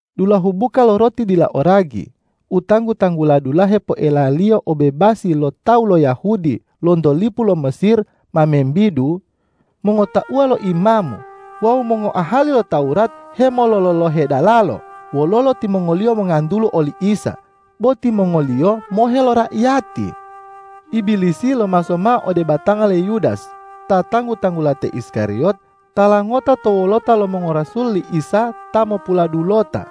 Dulahu buka lo roti dila o ragi, u tanggu-tanggula dulahe poelaliyo obebasi lo tawu lo Yahudi lonto lipu lo Mesir, ma membidu. Mongotauwa lo imamu wawu mongoahali lo Tawurat hemolololohe dalalo wololo timongoliyo mongantulu oli Isa, bo timongoliyo mohe lo raiyati. Ibilisi lomaso mao ode batanga le Yudas ta tanggu-tanggula te Iskariyot tala ngota to wolota lo mongorasul li Isa ta mopuladulota.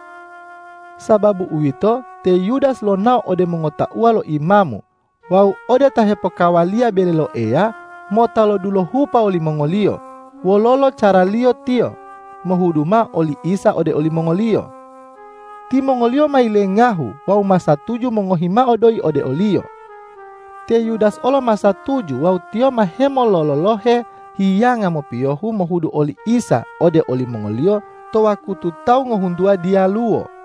Sababu uwito, te Yudas lonao ode mongotauwa lo imamu wawu ode ta hepokawaliya bele lo Eya mota lodulohupa wolimongoliyo, wololo caraliyo tiyo mohudu mao oli Isa ode olimongoliyo. Timongoliyo ma yilengahu wawu ma satuju mongohi mao doyi ode oliyo. Te Yudas olo ma satuju wawu tiyo ma hemolololohe hiyanga mopiyohu mohudu oli Isa ode olimongoliyo to wakutu tawu ngohuntuwa diyaluwo.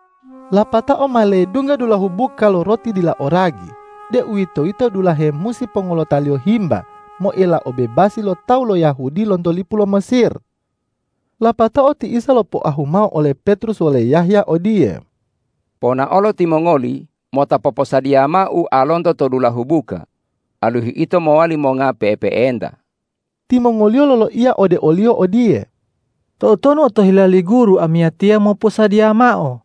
Lapatao ma ledungga dulahu buka lo roti dila o ragi, deuwitoyito dulahe musi pongolotaliyo himba moela obebasi lo tawu lo Yahudi lonto lipu lo Mesir. Lapatao ti Isa lopoahu mao ole Petrus wole Yahya odiye,”Ponaolo timongoli mota poposadiya mao ualonto to dulahu buka, alihu ito mowali monga pe'epe'enta.” Timongoliyo loloiya ode o-Liyo odiye,”Toutonu otohila li Guru amiyatiya moposadiya mao?”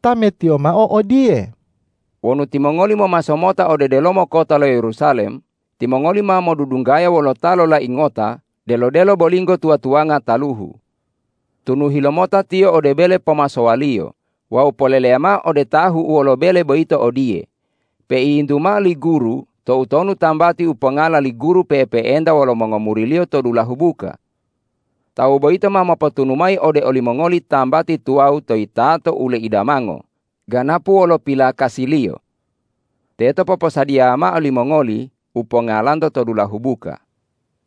Tametiyo mao odiye,”Wonu timongoli momaso mota ode delomo kota lo Yerusalem, timongoli ma modudunggaya wolo ta lolai ngota delo-delo bolinggo tuwa-tuwanga taluhu. Tunuhi lomota tiyo ode bele pomasowaliyo wawu poleleya mao ode tahu'uwo lo bele boyito odiye, ’Peiyintu mao li Guru toutonu tambati u pongala li Guru pe'epe'enta wolo mongomuri-Liyo to dulahu buka?’ Tawu boyito ma mopotunu mayi ode olimongoli tambati tuwawu to yitato u leidamango, ganapu wolo pilakasiliyo. Teto poposadiya mao limongoli u pongalanto to dulahu buka.”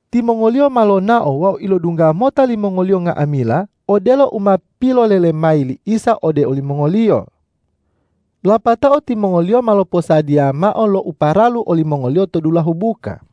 Timongoliyo ma lonao wawu ilodungga mota limongoliyo nga'amila odelo u ma pilolele mayi li Isa ode olimongoliyo. Lapatao timongoliyo ma loposadiya mao lo u paralu olimongoliyo to dulahu buka.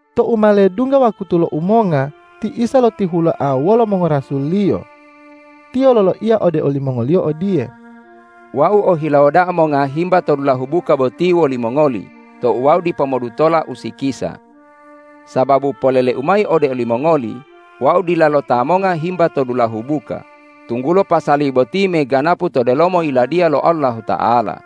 Tou ma ledungga wakutu lo umonga, ti Isa lotihuloa wolo mongorasul-Liyo. Tiyo loloiya ode olimongoliyo odiye,”Wau ohilawo da'a monga himba to dulahu buka boti wolimongoli tou wau dipo modutola usikisa! Sababu polele-U mayi ode olimongoli: Wau dilalo ta monga himba to dulahu buka, tunggulo pasali boti meganapu to delomo Yiladiya lo Allahuta'ala.”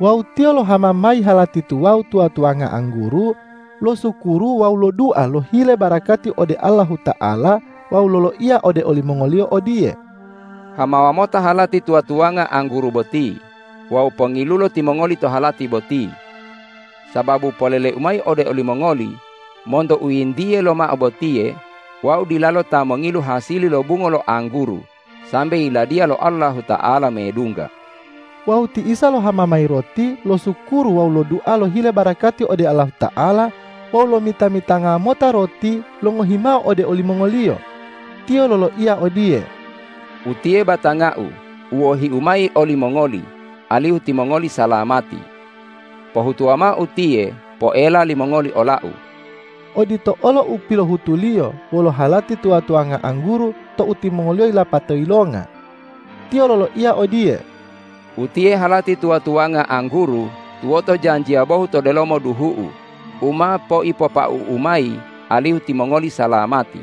Wawu Tiyo lohama mayi halati tuwawu tuwa-tuwanga angguru, losukuru wawu lodua lohile barakati ode Allahuta'ala wawu loloiya ode olimongoliyo odiye,”Hamawa mota halati tuwa-tuwanga angguru boti wawu pongilulo timongoli to halati boti. Sababu polele-U mayi ode olimongoli: Monto u yintiye lomao botiye Wau dilalo ta mongilu hasili lo bungo lo angguru sambe Yiladiya lo Allahuta'ala medungga.” Wawu ti Isa lohama mayi roti, losukuru wawu lodua lohile barakati ode Allahuta'ala wawu lomita-mitanga mota roti, longohimao ode olimongoliyo. Tiyo loloiya odiye,”Utiye batanga-U u wohi-U mayi olimongoli alihu timongoli salamati. Pohutuwa mao utiye poela limongoli ola-U.” Odito olo u pilohutu-Liyo wolo halati tuwa-tuwanga angguru tou timongoliyo yilapata yilonga. Tiyo loloiya odiye,”Utiye halati tuwa-tuwanga angguru tuwoto janjiya bohu to delomo duhu-U u ma poipopau-U mayi alihu timongoli salamati.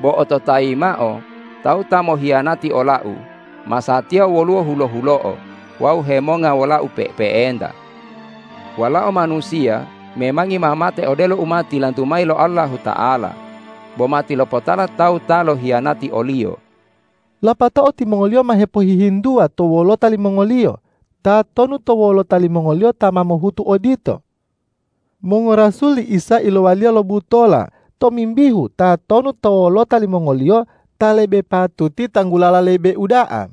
Bo ototayi mao: Tawu ta mohiyanati ola-U masatiya woluwo hulo-hulo'o wawu hemonga wola-U pe'epe'enta. Walao Manusiya memangi ma mate odelo u ma tilantu mayi lo Allahuta'ala, bo matilopotala tawu ta lohiyanati o-Liyo!” Lapatao timongoliyo ma hepohihintuwa to wolota limongoliyo, tatonu to wolota limongoliyo ta ma mohutu odito. Mongorasul li Isa ilowaliya lo butola tomimbihu tatonu to wolota limongoliyo ta lebe patuti tanggulala lebe uda'a.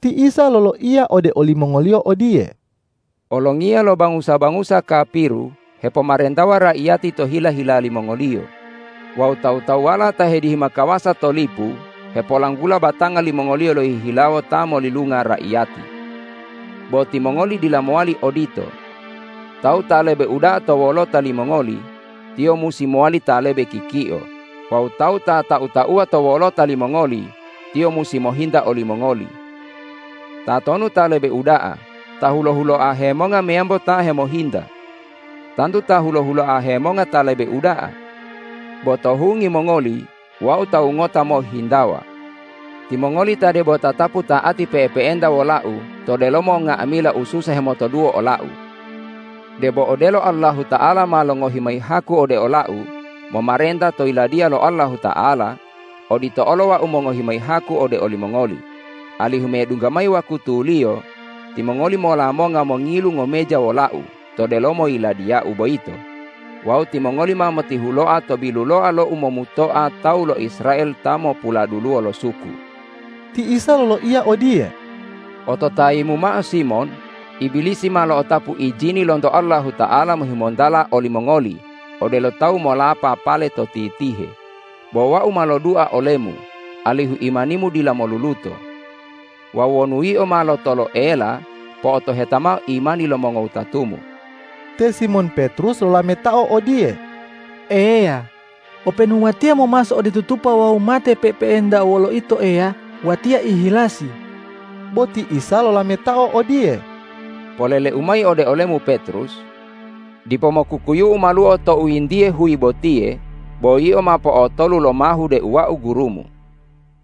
Ti Isa loloiya ode olimongoliyo odiye,”Olongiya lo bangusa-bangusa kapiru hepomarentawa raiyati to hila-hila limongoliyo wawu tawu-tawuwala ta hedihima kawasa to lipu hepolanggula batanga limongoliyo lohihilawo ta molilunga raiyati. Bo timongoli dila mowali odito. Tawu ta lebe uda'a to wolota limongoli, tiyo musi mowali ta lebe kikio; wawu tawu ta tau-tauwa to wolota limongoli, tiyo musi mohinta olimongoli. Tatonu ta lebe uda'a, ta hulo-huloa hemonga meyambo ta hemohinta? Tantu ta hulo-huloa hemonga ta lebe uda'a. Bo to hungi mongoli Wau tawu ngota mohhintawa. Timongoli ta debo tatapu ta'ati pe'epe'enta wola-U to delomo nga'amila ususa hemotoduwo ola-U. Debo odelo Allahuta'ala ma longohi mayi haku ode ola-U momarenta to Yiladiya lo Allahuta'ala, odito olo Wau mongohi mayi haku ode olimongoli, alihu medungga mayi wakutuliyo timongoli mola monga mongilu ngomeja wola-U to delomo Yiladiya-U boyito wawu timongoli ma motihuloa to biluloa lo umomutoa tawu lo Israel ta mopuladuluwo lo suku.” Ti Isa loloiya odiye,”Ototayimu mao Simon! Ibilisi ma lo'otapu ijini lonto Allahuta'ala mohimontala olimongoli odelo tawu molapa pale to titihe, bo Wau ma lodua olemu alihu imanimu dila moluluto. Wawu wonu yio ma lotoloela, po'otoheta mao imani lo mongowutatumu.” Te Simon Petrus lolametao odiye,”Eya, openu watiya momaso ode tutupa wawu mate pe'epe'enta wolo Ito Eya, watiya ihilasi!” Bo ti Isa lolametao odiye,”Polele-U mayi ode olemu Petrus: Dipo mokukuyu'u maluo tou yintiye huyi botiye bo yio ma potolu lomahu deu Wau Gurumu.”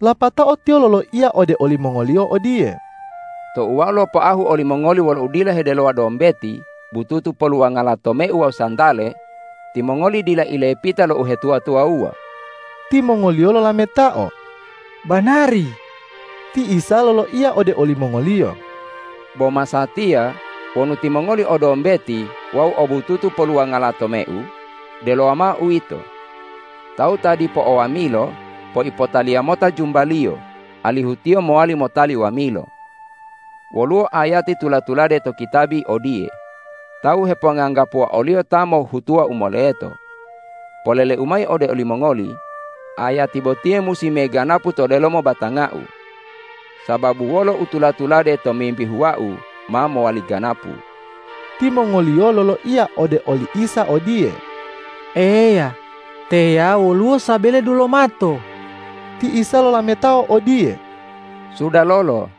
Lapatao Tiyo loloiya ode olimongoliyo odiye,”Tou Wau lopoahu olimongoli wolo udila hedelowa dombeti, bututu poluwangala tomeu wawu santale, timongoli dila ilepita lo uhetuwa-tuwawuwa.” Timongoliyo lolametao,”Banari!” Ti Isa loloiya ode olimongoliyo,”Bo masatiya, wonu timongoli o dombeti wawu o bututu poluwangala tomeu, delowa mao uwito. Tawu ta dipo o wamilo poipotaliya mota jumbaliyo, alihu tiyo mowali motali wamilo. Woluwo ayati tula-tulade to kitabi odiye, ’Tawu heponganggapuwa o-Liyo ta mohhutuwa u moleto.’ Polele-U mayi ode olimongoli: Ayati botiye musi meganapu to delomo batanga-U. Sababu wolo u tula-tulade tomimbihu Wau ma mowali ganapu.” Timongoliyo loloiya ode oli Isa odiye”Eya, teya woluwo sabele dulomato.” Ti Isa lolametao odiye,”Sudalolo!”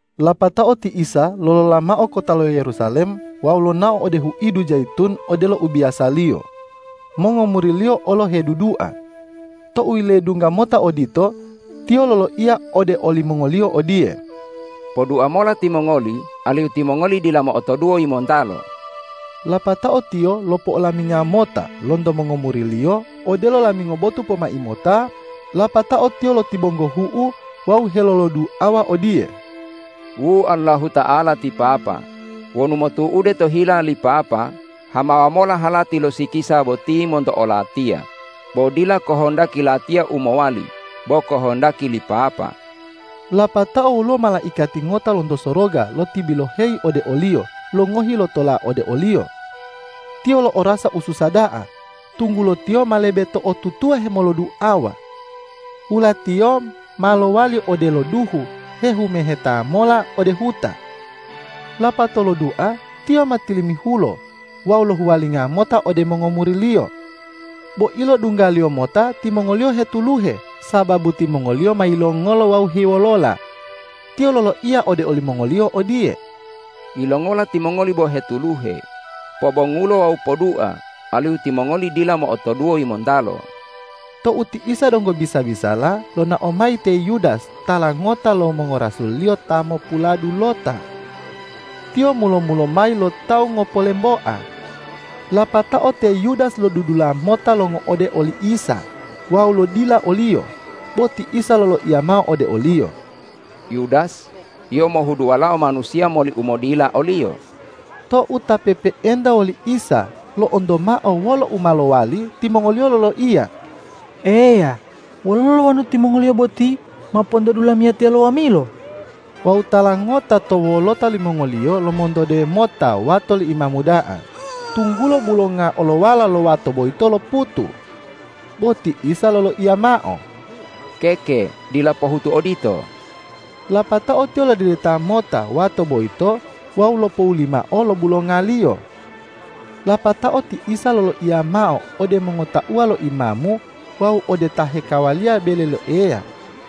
Lapatao ti Isa lolola mao kota lo Yerusalem wawu lonao ode huidu Jayitun odelo ubiyasaliyo. Mongomuri-Liyo olo hedudua. Tou yiledungga mota odito, Tiyo loloiya ode olimongoliyo odiye,”Podua mola timongoli alihu timongoli dila mo'otoduwo yimontalo.” Lapatao Tiyo lopo'olaminga mota lonto mongomuri-Liyo odelo lamingo botu pomai mota, lapatao Tiyo lotibonggohu'u wawu heloloduawa odiye, ”Wu Allahuta'ala ti Papa, wonu motu'ude to hila li Papa, hamawa mola halati lo sikisa boti monto o-Latiya, bo dila kohondaki Latiya u mowali bo kohondaki li Papa.” Lapatao woluwo malaikati ngota lonto soroga lotibiloheyi ode o-Liyo longohi lotola ode o-Liyo. Tiyo lo'orasa ususa da'a, tunggulo Tiyo ma lebe to'otutuwa hemoloduawa. Wula-Tiyo ma lowali odelo duhu hehumeheta mola ode huta. Lapatao lodua Tiyo ma tilimihulo wawu lohuwalinga mota ode mongomuri-Liyo. Bo ilodungga-Liyo mota timongoliyo hetuluhe, sababu timongoliyo ma yilongolo wawu hewolola. Tiyo loloiya ode olimongoliyo odiye,”Yilongola timongoli bo hetuluhe? Pobongulo wawu podua, alihu timongoli dila mo'otoduwo yimontalo.” Tou ti Isa donggo bisa-bisala, lonao mayi te Yudas tala ngota lo mongorasul-Liyo ta mopuladulota. Tiyo mulo-mulo mayi lo tawu ngopolemboa. Lapatao te Yudas lodudula mota longo'ode oli Isa wawu lodila o-Liyo. Bo ti Isa loloiya mao ode oliyo,”Yudas, yio mohudu Walao Manusiya moli umodila o-Liyo.” Tou ta pe'epe'enta woli Isa, lo'onto mao wolo u ma mowali, timongoliyo loloiya,”Eya, wololo wonu timongoliyo boti ma pontodu lamiyatiya lo wamilo?” Wawu tala ngota to wolota limongoliyo lomontode mota wato lo imamu da'a, tunggulo bulonga olowala lo wato boyito loputu. Bo Ti Isa loloiya mao,”Keke, dila pohutu odito!” Lapatao Tiyo lodedeta mota wato boyito wawu lopowuli mao lo bulongaliyo. Lapatao ti Isa loloiya mao ode mongotauwa lo imamu wawu ode ta hekawaliya bele lo Eya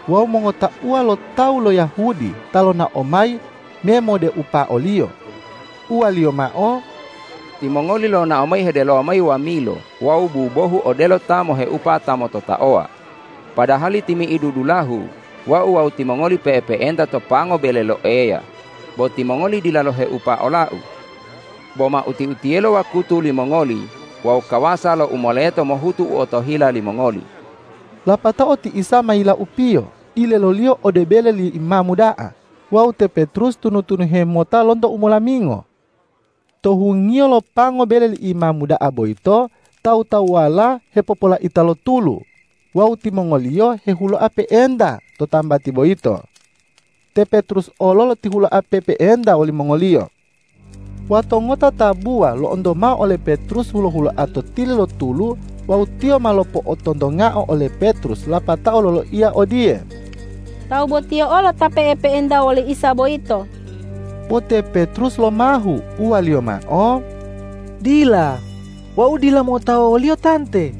wawu mongotauwa lo tawu lo Yahudi ta lonao mayi memodeupa o-Liyo, uwa-Liyo mao,”Timongoli lonao mayi hedelowa wamilo wawu bubohu, odelo ta moheupa ta mototaowa, padahali timi'idu dulahu Wau wawu timongoli pe'epe'enta to pango bele lo Eya bo timongoli dila loheupa ola-U. Bo ma uti-utiyelo wakutu limongoli wawu kawasa lo u moleto mohutu u otohila limongoli.” Lapatao ti Isa ma yilaupiyo dileloliyo ode bele li imamu da'a wawu te Petrus tunu-tunuhe mota lonto umolamingo. To hungiyo lo pango bele li imamu da'a boyito, tawu-tawuwala hepopolaita lo tulu wawu timongoliyo hehuloa pe'enta to tambati boyito. Te Petrus olo lotihuloa pe'epe'enta wolimongoliyo. Wato ngota tabuwa lo'onto mao ole Petrus hulo-huloa to tili lo tulu wawu tiyo ma lopo'otontongao ole Petrus lapatao loloiya odiye,”Tawu botiye olo ta pe'epe'enta woli Isa boyito.” Bo te Petrus lomahu, uwaliyo mao,”Dila, wau dila mo'otawa wo-Liyo tante!”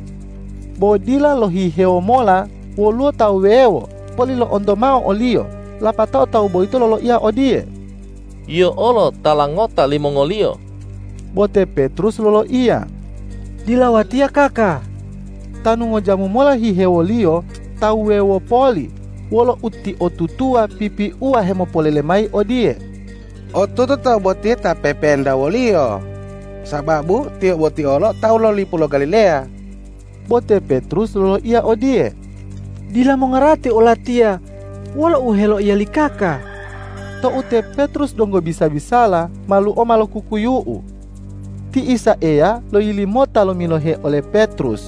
Bo dila lohihewo mola woluwo tawu wuwewo poli lo'onto mao oliyo, lapatao tawu boyito loloiya odiye,”Yio olo tala ngota limongoliyo!” Bo te Petrus loloiya,”Dila watiya kaka!” Tanu ngojamu mola hihewoliyo tawu wuwewo poli wolo utiotutuwa pipiuwa hemopolele mayi odiye,”Otutu tawu botiye ta pe'epe'enta wo-Liyo, sababu tiyo boti olo tawu lo lipu lo Galileya!” Bo te Petrus loloiya odiye,”Dila mongarati olatiya wolo u heloiya li kaka!” Tou te Petrus donggo bisa-bisala, maluo ma lokukuyu'u. Ti Isa Eya loyili mota lomilohe ole Petrus.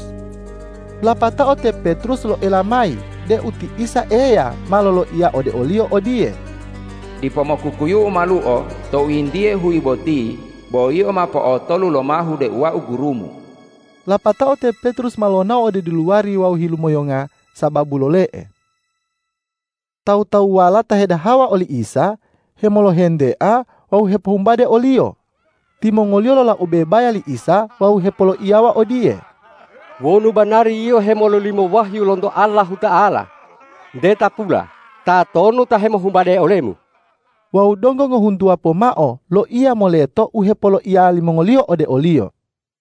Lapatao te Petrus loela mayi deu ti Isa Eya ma loloiya ode oliyo odiye,”Dipo mokukuyu'u maluo tou yintiye huyi boti bo yio ma po'otolu lomahu deu Wau gurumu.” Lapatao te Petrus ma lonao ode diluwari wawu hilumoyonga sababu lole'e. Tawu-tawuwala ta hedahawa oli Isa, hemolohentea wawu hepohumbade o-Liyo. Timongoliyo lolaube baya li Isa wawu hepoloiyawa odiye,”Wonu banari Yio hemololimo wahyu lonto Allahuta'ala, nte tapula tatonu ta hemohumbade ole-Mu.” Wawu donggo ngohuntuwa pomao loiya moleto u hepoloiya limongoliyo ode o-Liyo.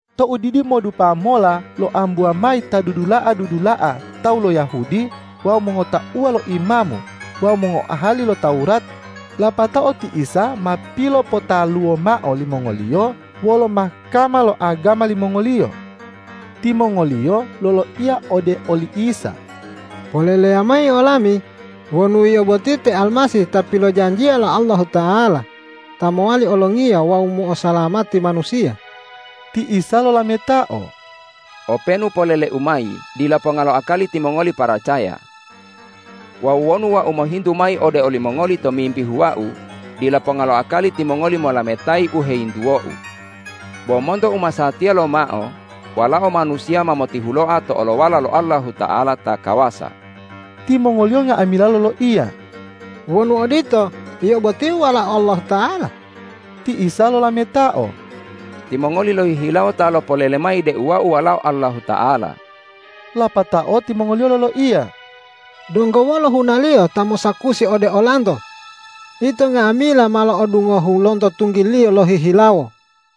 Tou didimodupa mola loambuwa mayi ta dudula'a-dudula'a tawu lo Yahudi wawu mongotauwa lo imamu wawu mongoahali lo Tawurat, lapatao ti Isa ma pilopotaluwo mao limongoliyo wolo Mahkama lo agama limongoliyo. Timongoliyo loloiya ode oli Isa,”Poleleya mayi olami wonu Yio boti te Almasih ta pilojanjiya lo Allahuta'ala ta mowali olongiya wawu mo'osalamati manusiya.” Ti Isa lolametao,”Openu polele-U mayi, dila ponga lo akali timongoli paracaya. Wawu wonu Wau mohintu mayi ode olimongoli tomimbihu Wau, dila ponga lo akali timongoli molametayi u heyintuwo-U. Bo monto umasatiya lomao Walao Manusiya ma motihuloa to olowala lo Allahuta'ala ta kawasa.” Timongoliyo nga'amila loloiya,”Wonu odito, Yio botiye Walao Allahuta'ala?” Ti Isa lolametao,”Timongoli lohihilawo ta lopolele mayi deu Wau Walao Allahuta'ala!” Lapatao timongoliyo loloiya,”Donggo wolo hunaliyo ta mosakusi ode olanto? Ito nga'amila ma lo'odungohu lonto tunggiLiyo lohihilawo!”